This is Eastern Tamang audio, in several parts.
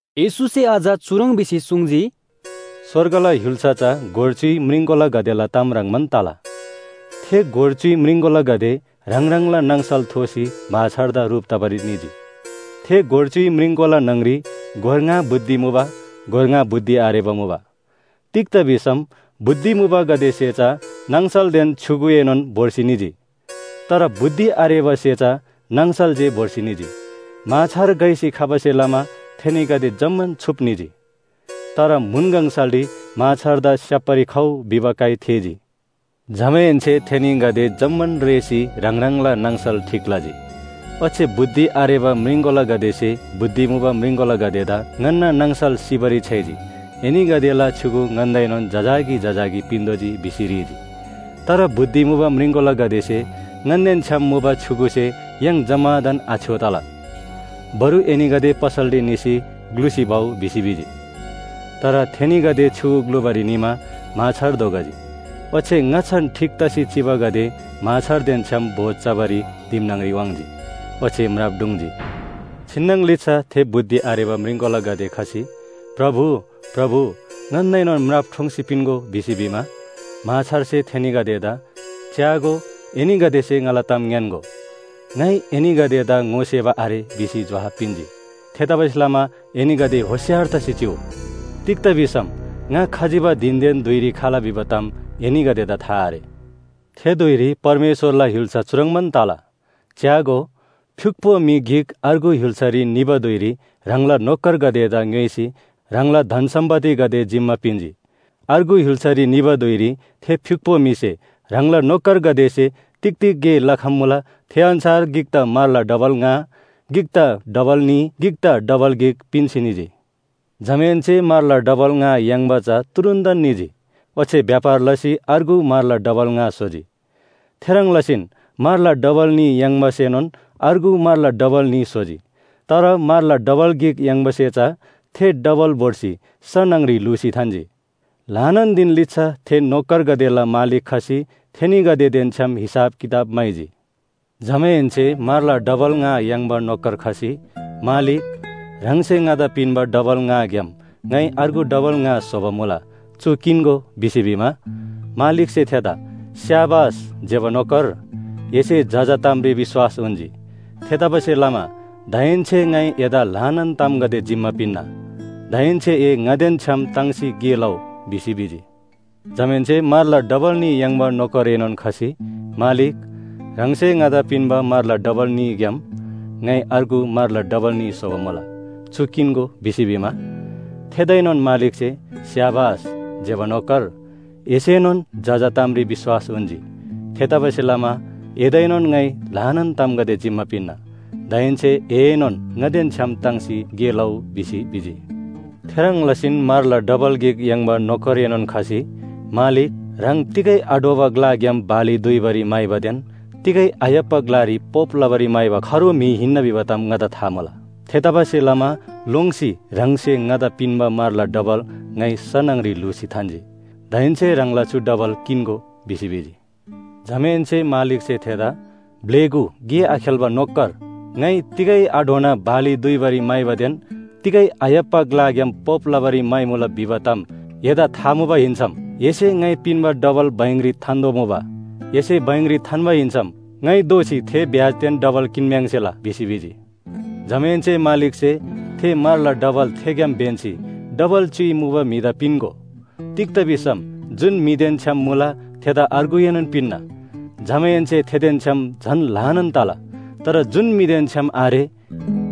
येशूसे अझ चुह्रङ् भिसी सुङ्जी, “स्‍वर्गला य्‍हुल्‍सा चा गोर च्‍युइ म्रिङकोलागदेला ताम ह्रङ्‌बान तला। थे गोर च्‍युइ म्रिङकोलागदे ह्राङ ह्राङला नाङसल थोसी म्‍हाछारदा ह्रुप तबारी निजी। थे गोर च्‍युइ म्रिङकोला न्‍हङ‍री गोर ङा बुद्धि मुबा, गोर ङा बुद्धि आरेबा मुबा। तिग्‍दा भिसम बुद्धि मुबागदेसे चा नाङसलदेन छ्‌युगुएनोन भोर्सी निजी, तर बुद्धि आरेबासे चा नाङसल जे भोर्सी निजी। म्‍हाछार घइसी खबासे लमा थेनीगदे जम्‍मान छुप निजी। “तर म्‍हुन गङसलरी ‘म्‍हाछारदा स्‍याप्‍बारी खउ’ भिबा काइ थेःजी। जमाहेन्‍से थेनीगदे जम्‍मान रेःसी ह्राङ ह्राङला नाङसल ठीक लजी। ओच्‍छे बुद्धि आरेबा म्रिङकोलागदेसे बुद्धि मुबा म्रिङकोलागदेदा ‘ङन्‍ना नाङसल सिबारी छ्‌याइजी, एनीगदेला छ्‌युगु ङन्‍दाएनोन जजाकी जजाकी पिन्‍तोःजी’ भिसी ह्रीजी। तर बुद्धि मुबा म्रिङकोलागदेसे ‘ङन्‍देन छ्‌याम मुबा छ्‌युगुसे य्‍हाङ जम्‍मादान आछ्‌यो तला। बरु एनीगदे पसलरी निसी ग्‍लुसी भउ’ भिसी भिजी। “तर थेनीगदे छ्‌युगु ग्‍लुबारी निमा म्‍हाछार धोखजी। ओच्‍छे ङाच्‍छान ठीक तसी चिबागदे म्‍हाछारदेन छ्‌याम भोज चबारी दिम न्‍हङ‍री वाङ्‌जी। ओच्‍छे म्राप ढुङ्‌जी। “छिन्‍नङ लिच्‍छा थे बुद्धि आरेबा म्रिङकोलागदे खसी ‘प्रभु, प्रभु ङन्‍दाएनोन म्राप ठोङ्सी पिन्‍गो’ भिसी भिमा, म्‍हाछारसे थेनीगदेदा ‘च्‍यागो, एनीगदेसे ङाला ताम ङ्‌यान्‍गो, ङाइ एनीगदेदा ङोसेबा आरे’ भिसी जोहाब पिन्‍जी। “थेतबासेलमा एनीगदे होशियार तसी चिउ। तिग्‍दा भिसम ङा खजिबा धिनदेन धुइरी खला भिबा ताम एनीगदेदा था आरे। “थे धुइरी परमेश्‍वरला य्‍हुल्‍सा चुह्रङ्बान तला, च्‍यागो, फ्‍युक्‍पो म्‍हि गिक अर्गु य्‍हुल्‍सारी निबा धुइरी ह्राङला नोकरगदेदा ङ्‌योइसी ह्राङला धन सम्‍पत्तिगदे जिम्‍मा पिन्‍जी। अर्गु य्‍हुल्‍सारी निबा धुइरी थे फ्‍युक्‍पो म्‍हिसे ह्राङला नोकरगदेसे तिग तिग गे लखम्‍मुला थे अन्‍छार गिकदा म्‍हरला डबल ङा, गिकदा डबल न्‍ही, गिकदा डबल गिक पिन्‍सी निजी। “जमाहेन्‍से म्‍हरला डबल ङा याङ्बा चा तुरुन्‍तन निजी। ओच्‍छे व्‍यापार लसी अर्गु म्‍हरला डबल ङा स्‍होजी। थेह्रङ् लसीन म्‍हरला डबल न्‍ही याङ्बासेनोन अर्गु म्‍हरला डबल न्‍ही स्‍होजी। तर म्‍हरला डबल गिक याङ्बासे चा थे डबल भोर्सी स न्‍हङ‍री ल्‍हुसी थान्‍जी। “ल्‍हानान धिन लिच्‍छा थे नोकर‍गदेला मालिक खसी थेनीगदेदेन छ्‌याम हिसाब किताब म्‍हाइजी। जमाहेन्‍से म्‍हरला डबल ङा याङ्बा नोकर खसी ‘मालिक, ह्राङसे ङादा पिन्‍बा डबल ङाग्‍याम ङाइ अर्गु डबल ङा स्‍होबा मुला, चु किन्‍गो’ भिसी भिमा, मालिकसे थेदा ‘स्‍याबास ज्‍यबा नोकर, एसे जजा तामरी विश्‍वास उन्‍जी। थेतबासेलमा दाहेन्‍से ङाइ एदा ल्‍हानान तामगदे जिम्‍मा पिन्‍ना। दाहेन्‍से ए ङादेन छ्‌याम ताङ्सी गे लउ’ भिसी भिजी। “जमाहेन्‍से म्‍हरला डबल न्‍ही याङ्बा नोकरएनोन खसी ‘मालिक, ह्राङसे ङादा पिन्‍बा म्‍हरला डबल न्‍हीग्‍याम ङाइ अर्गु म्‍हरला डबल न्‍ही स्‍होबा मुला, चु किन्‍गो’ भिसी भिमा, थेदाएनोन मालिकसे ‘स्‍याबास ज्‍यबा नोकर, एसेनोन जजा तामरी विश्‍वास उन्‍जी। थेतबासेलमा एदाएनोन ङाइ ल्‍हानान तामगदे जिम्‍मा पिन्‍ना। दाहेन्‍से एएनोन ङादेन छ्‌याम ताङ्सी गे लउ’ भिसी भिजी। “थेह्रङ् लसीन म्‍हरला डबल गिक याङ्बा नोकरएनोन खसी ‘मालिक, ह्राङ तिगै आढ्‍वबा ग्‍लाग्‍याम बाली दुइबारी म्‍हाइबादेन तिगै आय्‍हाप्‍बा ग्‍लारी पोप लबारी म्‍हाइबा खरो म्‍हि हिन्‍ना भिबा ताम ङादा था मुबा। थेतबासेलमा लोङ्सी ह्राङसे ङादा पिन्‍बा म्‍हरला डबल ङाइ स न्‍हङ‍री ल्‍हुसी थान्‍जी। दाहेन्‍से ह्राङला चु डबल किन्‍गो’ भिसी भिजी। “जमाहेन्‍से मालिकसे थेदा ‘ब्‍लेगु गे आखेल्‍बा नोकर, ङाइ तिगै आढ्वना बाली दुइबारी म्‍हाइबादेन तिगै आय्‍हाप्‍बा ग्‍लाग्‍याम पोप लबारी म्‍हाइमुला भिबा ताम एदा था मुबा हिन्‍सम, एसे ङाइ पिन्‍बा डबल बैंकरी थान्‍तोःबा मुबा, एसे बैंकरी थान्‍बा हिन्‍सम ङाइ दोःसी ब्‍याजदेन थे डबल किन्‍म्‍याङ्सेला’ भिसी भिजी। “जमाहेन्‍से मालिकसे ‘थे म्‍हरला डबल थेग्‍याम ब्‍यन्‍सी डबल च्‍युइ मुबा म्‍हिदा पिन्‍गो। तिग्‍दा भिसम जुन म्‍हिदेन छ्‌याम मुला थेदा अर्गुएनोन पिन्‍ना। जमाहेन्‍से थेदेन छ्‌याम झन ल्‍हानान तला। तर जुन म्‍हिदेन छ्‌याम आरे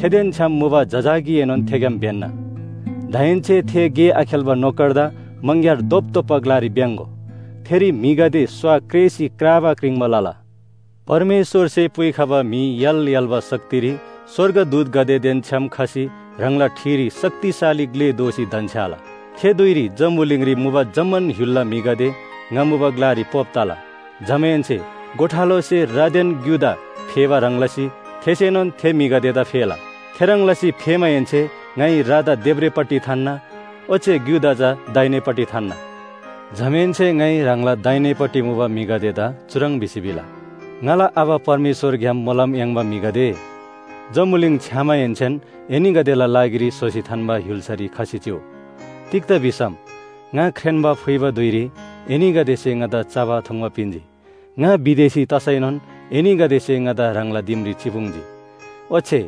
थेदेन छ्‌याम मुबा जजाकीएनोन थेग्‍याम ब्‍यन्‍ना। दाहेन्‍से थे गे आखेल्‍बा नोकरदा मङग्‍यार धोपधोप्‍बा ग्‍लारी भ्‍याङ्‍गो। थेरी म्‍हिगदे स्‍वा क्रेसी क्राबा क्रिङ्बा लला।’ “परमेश्‍वरसे पुइखबा म्‍हि य्‍हाल य्‍हाल्‍बा शक्तिरी स्‍वर्गदूतगदेदेन छ्‌याम खसी ह्राङला ठिरी शक्तिशाली ग्‍ले दोसी धन्‍छ्‌याला। थे धुइरी जम्‍बुलिङरी मुबा जम्‍मान य्‍हुलला म्‍हिगदे ङा मुबा ग्‍लारी पोप तला। जमाहेन्‍से गोठालोसे रादेन ग्‍युदा फेबा ह्रङ् लसी थेसेनोन थे म्‍हिगदेदा फेला। थेह्रङ् लसी फेमाहेन्‍से ङाइ रादा देब्रेपट्टि थान्‍ना। ओच्‍छे ग्‍युदा चा दाहिनेपट्टि थान्‍ना। “जमाहेन्‍से ङाइ ह्राङला दाहिनेपट्टि मुबा म्‍हिगदेदा चुह्रङ् भिसी भिला, ‘ङाला आबा परमेश्‍वरग्‍याम मोलम याङ्बा म्‍हिगदे! जम्‍बुलिङ छ्‌यामाहेन्‍सेन एनीगदेला लागिरी स्‍होसी थान्‍बा य्‍हुल्‍सारी खसी चिउ। तिग्‍दा भिसम ङा ख्रेन्‍बा फुइबा धुइरी एनीगदेसे ङादा चबा थुङ्बा पिन्‍जी। ङा विदेशी तसैनोन एनीगदेसे ङादा ह्राङला दिमरी चिपुङ्जी। ओच्‍छे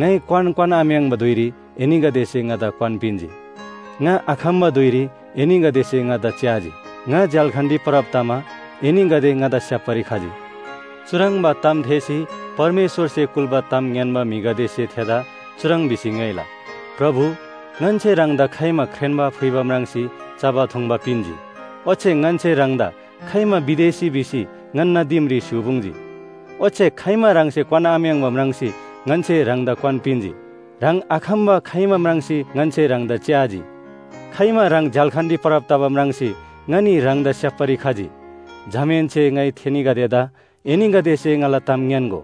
ङाइ क्‍वान क्‍वान्‍आम्‍याङ्बा धुइरी एनीगदेसे ङादा क्‍वान पिन्‍जी। ङा आखम्‍बा धुइरी एनीगदेसे ङादा च्‍याजी, ङा झ्‍याल्‍खानरी परब तमा एनीगदे ङादा स्‍याप्‍बारी खजी।’ “चुह्रङ्बा ताम थेःसी परमेश्‍वरसे कुल्‍बा ताम ङ्‌यान्‍बा म्‍हिगदेसे थेदा चुह्रङ् भिसी ङ्‌योइला, ‘प्रभु, ङन्‍से ह्राङदा खाइमा ख्रेन्‍बा फुइबा म्राङ्सी चबा थुङ्बा पिन्‍जी? ओच्‍छे ङन्‍से ह्राङदा खाइमा विदेशी भिसी ङन्‍ना दिमरी स्‍य्‍हूपुङ्जी, ओच्‍छे खाइमा ह्राङसे क्‍वानआम्‍याङ्बा म्राङ्सी ङन्‍से ह्राङदा क्‍वान पिन्‍जी। ह्राङ आखम्‍बा खाइमा म्राङ्सी ङन्‍से ह्राङदा च्‍याजी? खाइमा ह्राङ झ्‍याल्‍खानरी परब तबा म्राङ्सी ङनी ह्राङदा स्‍याप्‍बारी खजी?’ “जमाहेन्‍से ङाइ थेनीगदेदा ‘एनीगदेसे ङाला ताम ङ्‌यान्‍गो,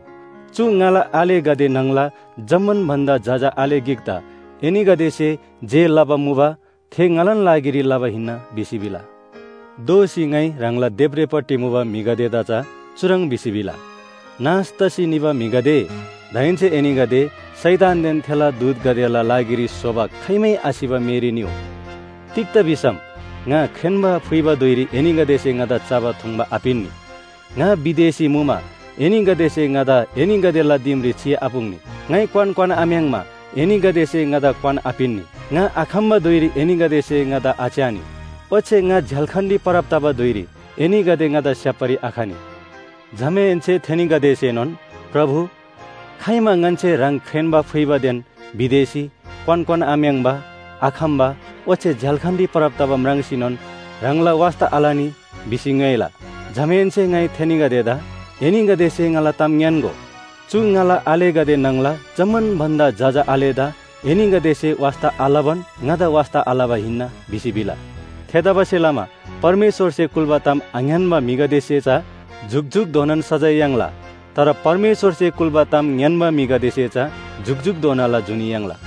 चु ङाला आलेगदे न्‍हङला जम्‍मान भन्‍दा जजा आले गिकदा एनीगदेसे जे लबा मुबा थे ङालान लागिरी लबा हिन्‍ना’ भिसी भिला। “दोःसी ङाइ ह्राङला देब्रेपट्टि मुबा म्‍हिगदेदा चा चुह्रङ् भिसी भिला, ‘नाश तसी निबा म्‍हिगदे, दाहेन्‍से एनीगदे शैतानदेन थेला दूतगदेला लागिरी स्‍होबा खाइमै आसिबा मेरी निउ! तिग्‍दा भिसम ङा ख्रेन्‍बा फुइबा धुइरी एनीगदेसे ङादा चबा थुङ्बा आपिन्‍नी। ङा विदेशी मुमा एनीगदेसे ङादा एनीगदेला दिमरी चिआपुङ्नी। ङाइ क्‍वान क्‍वान्‍आम्‍याङ्मा एनीगदेसे ङादा क्‍वान आपिन्‍नी। ङा आखम्‍बा धुइरी एनीगदेसे ङादा आच्‍यानी। ओच्‍छे ङा झ्‍याल्‍खानरी परब तबा धुइरी एनीगदे ङादा स्‍याप्‍बारी आखनी।’ “जमाहेन्‍से थेनीगदेसेनोन ‘प्रभु, खाइमा ङन्‍से ह्राङ ख्रेन्‍बा फुइबादेन विदेशी, क्‍वान क्‍वान्‍आम्‍याङ्बा, आखम्‍बा ओच्‍छे झ्‍याल्‍खानरी परब तबा म्राङ्सीनोन ह्राङला वास्‍ता आलनी?’ भिसी ङ्‌योइला। “जमाहेन्‍से ङाइ थेनीगदेदा ‘एनीगदेसे ङाला ताम ङ्‌यान्‍गो, चु ङाला आलेगदे न्‍हङला जम्‍मान भन्‍दा जजा आलेदा एनीगदेसे वास्‍ता आलबान ङादा वास्‍ता आलबा हिन्‍ना’ भिसी भिला। “थेतबासेलमा परमेश्‍वरसे कुल्‍बा ताम आङ्‌यान्‍बा म्‍हिगदेसे चा जुकजुकधोनान सजाय याङ्ला। तर परमेश्‍वरसे कुल्‍बा ताम ङ्‌यान्‍बा म्‍हिगदेसे चा जुकजुकधोनाला जुनी याङ्ला।”